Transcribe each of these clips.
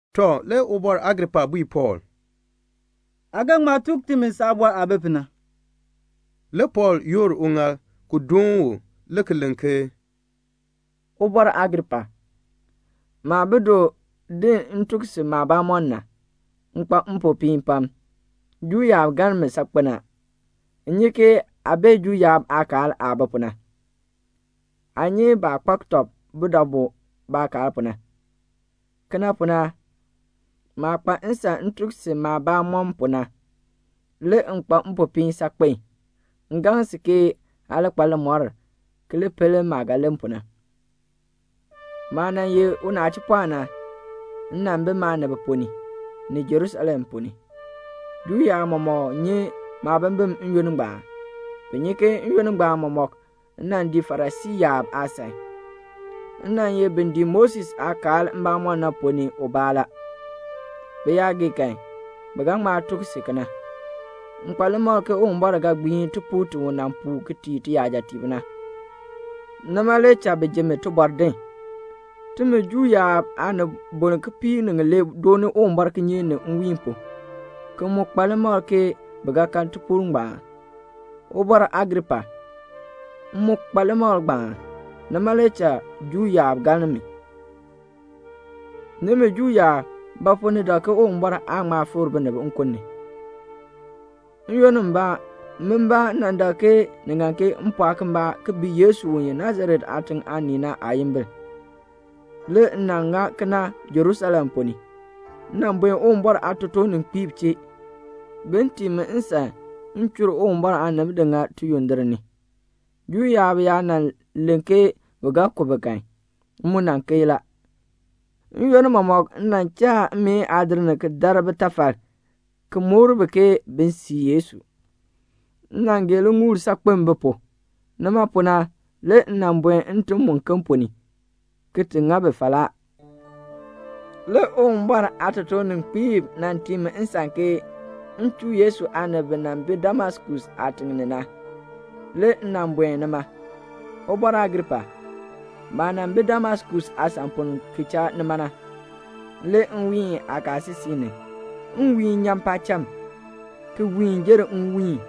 Tɔ, le Ubɔr Agripa bui Pɔɔl, "Aa ga ŋma tuk timi saabɔr aah bi pu na." Le Pɔɔl yoor uŋaal ki doon u, le ki len ke, "Ubɔr Agripa, maah bi du din m tuk si maabamɔn na, m kpa mpopiin pam. Juu yaab galn mi saakpen a. M nyi ke aa bee Juu yaab aakaal aah bi pu na. Aa nyi baah kpak tɔb budabu pu baakaal pu na. Kena pu na, maah kpa nsan m tuk si maabamɔn pu na, le m kpa mpopiin saakpen. M gaŋ si ke aa li kpa limɔr ki li pel maah ga len pu na. "Maah nan ye unachipɔɔn na, m nan bi maanib ponn ni, ni Jerusalem ponn ni. Juu yaab mɔmɔk nyi maabimbin n-yoonn ngbaan. Bi nyi ke n-yoonn ngbaan mɔmɔk m nan dii Farisii yaab aasan. M nan ye bin dii Moses aakaal mbamɔm na ponn ni ubaa la. Bi yaa gee kan, bi ga ŋma tuk si kena. M kpa limakl ke Uwumbɔr ga gbiin tipuul ti u nan puu ki tii tiyajatiib na. Nima le cha ni ji mi tibɔr din. Timi Juu yaab aanibol kipiik ni ŋilee dooni Uwumbɔr kinyeek ni nwiin pu, ki mu kpa limakl ke bi ga kan tipuul ngbaan. Ubɔr Agripa, m mu kpa limakl ngbaan, nima le cha Juu yaab galn mi. Nimi Juu yaab, ba pu ni dak ke Uwumbɔr aan ŋma fikr binib nkun ni? "N-yoonn mbaa min mbaa nan dak ke ni ŋan ke m pɔɔk mbaa ki bii Yesu u ye Nasaret aatiŋ aanii na aayimbil. Le m nan ŋa kena Jerusalem ponn ni. M nan buen Uwumbɔr aatotoorninkpiib chee, bin tii mi nsan m chur Uwumbɔr aanib di ŋa tiyondir ni. Juu yaab yaa nan len ke bi ga ku bi kan, m mu nan keei la. N-yoonn mɔmɔk m nan cha mmeen aadir ni ki dar bitafal, ki mukr bi ke bin sii Yesu. M nan gee liŋuul saakpen bi pu; nima pu na le m nan buen ntim muken ponn ni, ki ti ŋa bi falaa." "Le Uwumbɔr aatotoorninkpiib nan tii mi nsan ke m chuu Yesu aanib bi nan bi Damaskus aatiŋ ni na. Le m nan buen nima. Ubɔr Agripa, maah nan bi Damaskus aasan pu na, ki cha nima, le nwiin kaasisik ni, le nwiihn nyan paacham, ki wiin jer nwiin,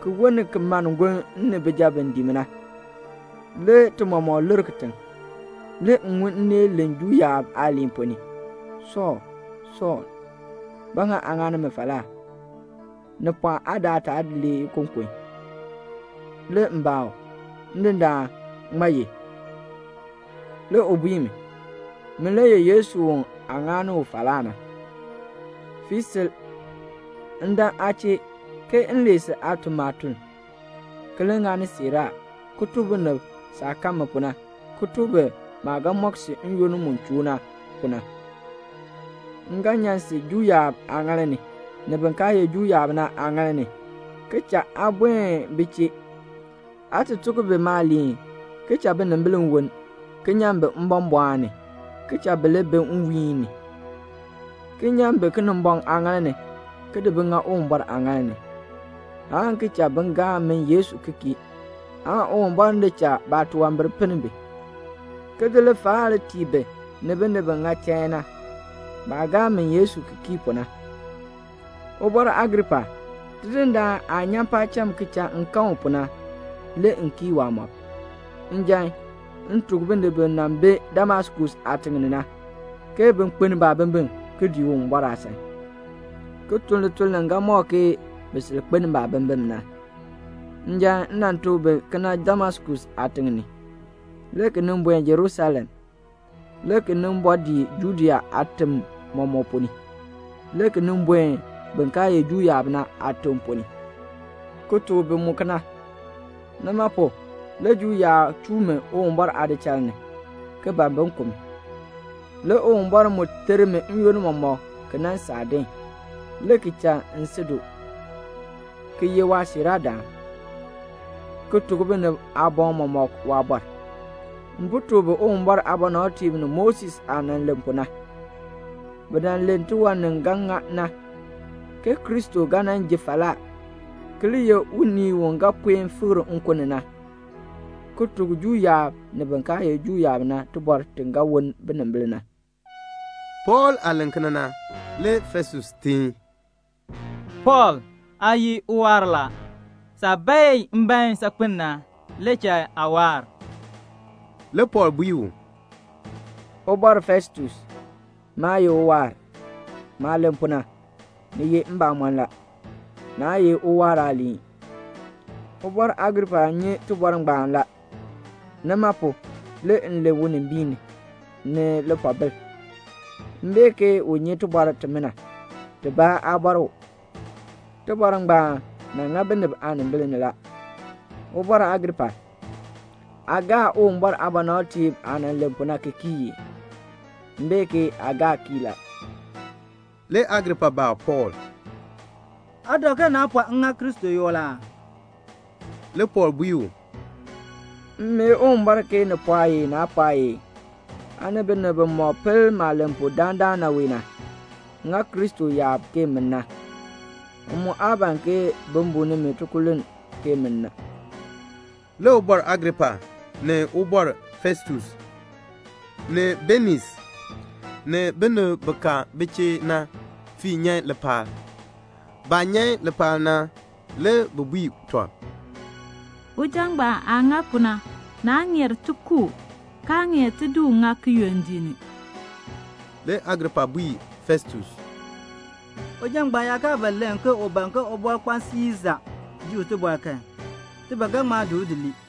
ki woln ki mann gonn m ni bijab bi dii na. Le ti mɔmɔk lir kitiŋ. Le m ŋun nneel len Juu yaab aaliin ponn ni, 'Sɔɔl, Sɔɔl, ba ŋa aa ŋa mi falaa? Ni pɔɔ aa di aataal lee ikokon.' Le m baa u, 'Ndindaan, ŋmaa ye?' Le u bui mi, 'Min le ye Yesu u aa ŋa u falaa na. Fii sil. M dan aa chee, ke m lee si aa tun maatuln, ki li ŋani siiraa, ki tuk binib saah kan mi pu na, ki tuk bi maah ga mɔk si n-yoonn mu choo na pu na. M ga nyan si Juu yaab aaŋaal ni, ni bin kaa ye Juu yaab na aaŋaal ni, ki cha aa buen bi chee, aa ti tuk bi maaliin, ki cha binimbil woln, ki nyan bi mbɔmbɔɔn ni, ki cha bi li bi nwiihn ni, ki nyan bi Kinimbɔŋ aaŋaal ni, ki di bi ŋa Uwumbɔr aaŋaal ni, aan ki cha bi gaa min Yesu ki kii, aan Uwumbɔr di cha baatunwambir pinn bi, ki di lifaal tii bi ni binib bi ŋa chain na, baah gaa min Yesu ki kii pu na."' "Ubɔr Agripa, Tidindaan aah nyan paacham ki cha m kan u pu na, le m kii waamɔb. Njan, m tuk binib bi nan bi Damaskus aatiŋ ni na, ke bin kpeln baabimbin, ki dii Uwumbɔr aasan, ki tun lituln li ga mɔk ke bi sil kpeln baabimbin na. Njan m nan tuk bi kena Damaskus aatiŋ ni, le ki nin buen Jerusalem, le ki nin bɔɔ dii Judea aatim mɔmɔk ponn ni, le ki nin buen bin kaa ye Juu yaab na aatim ponn ni, ki tuk bi mu kena. Nima pu, le Juu yaab chuu mi Uwumbɔr aadichal ni, ki ban bin ku mi. Le Uwumbɔr mu ter mi n-yoonn mɔmɔk ki nan saa din, le ki cha m si du, ki ye waasiiraadaan, ki tuk binib aaboŋ mɔmɔk waabɔr. M po tuk bi Uwumbɔr aabɔnabtiib ni Moses aah nan len pu na. Bi nan len tiwan ni ga ŋa na, ke Kristo ga nan ji falaa, ki li ye unii u ga puen fikr nkun ni na, ki tuk Juu yaab ni bin kaa ye Juu yaab na tibɔr ti ga woln binimbil na." Pɔɔl aah len kena na, le Festus teen, "Pɔɔl, aa ye uwaar la. Saah bae mbaen saakpen na, le cha aa waar." Le Pɔɔl bui u, "Ubɔr Festus, maa ye uwaar. Maah len pu na, ni ye mbamɔn la. Naa ye uwaar aaliin. Ubɔr Agripa nyi tibɔr ngbaan la. Nima pu, le m len unimbiin ni, ni lipoobil. M bee ke u nyi tibɔr timina, tibaa aa bɔr u. Tibɔr ngbaan nan ŋa binib aanimbil ni la. Ubɔr Agripa, aa gaa Uwumbɔr aabɔnabtiib aah nan len pu na ki kii ii? M bee ke aa gaa kii la." Le Agripa baa Pɔɔl, "Aa dak ke naa pɔɔ m ŋa Kristo yoo la aa?" Le Pɔɔl bui u, "M mee Uwumbɔr ke ni pɔɔye naa pɔɔye, aa ni binib bimɔk pel maah len pu dandana wee na, ŋa Kristo yaab ke min na. M mu aa ban ke bi buu nimi tikululn, ke min na." Le Ubɔr Agripa, ni Ubɔr Festus, ni Beniis, ni binib bi ka bi chee na, fii nyan lipaal. Baah nyan lipaal na, le bi bui tɔb, "Uja ngbaan aah ŋa pu na, naa ŋeer ti ku u, kaa ŋeer ti di u ŋa kiyondiik ni." Le Agripa bui Festus, "Uja ngbaan yaa kaa ba len ke u ban ke Ubɔrkpaan Siisa ji u tibɔr kan, ti ba ga ŋma di u lii."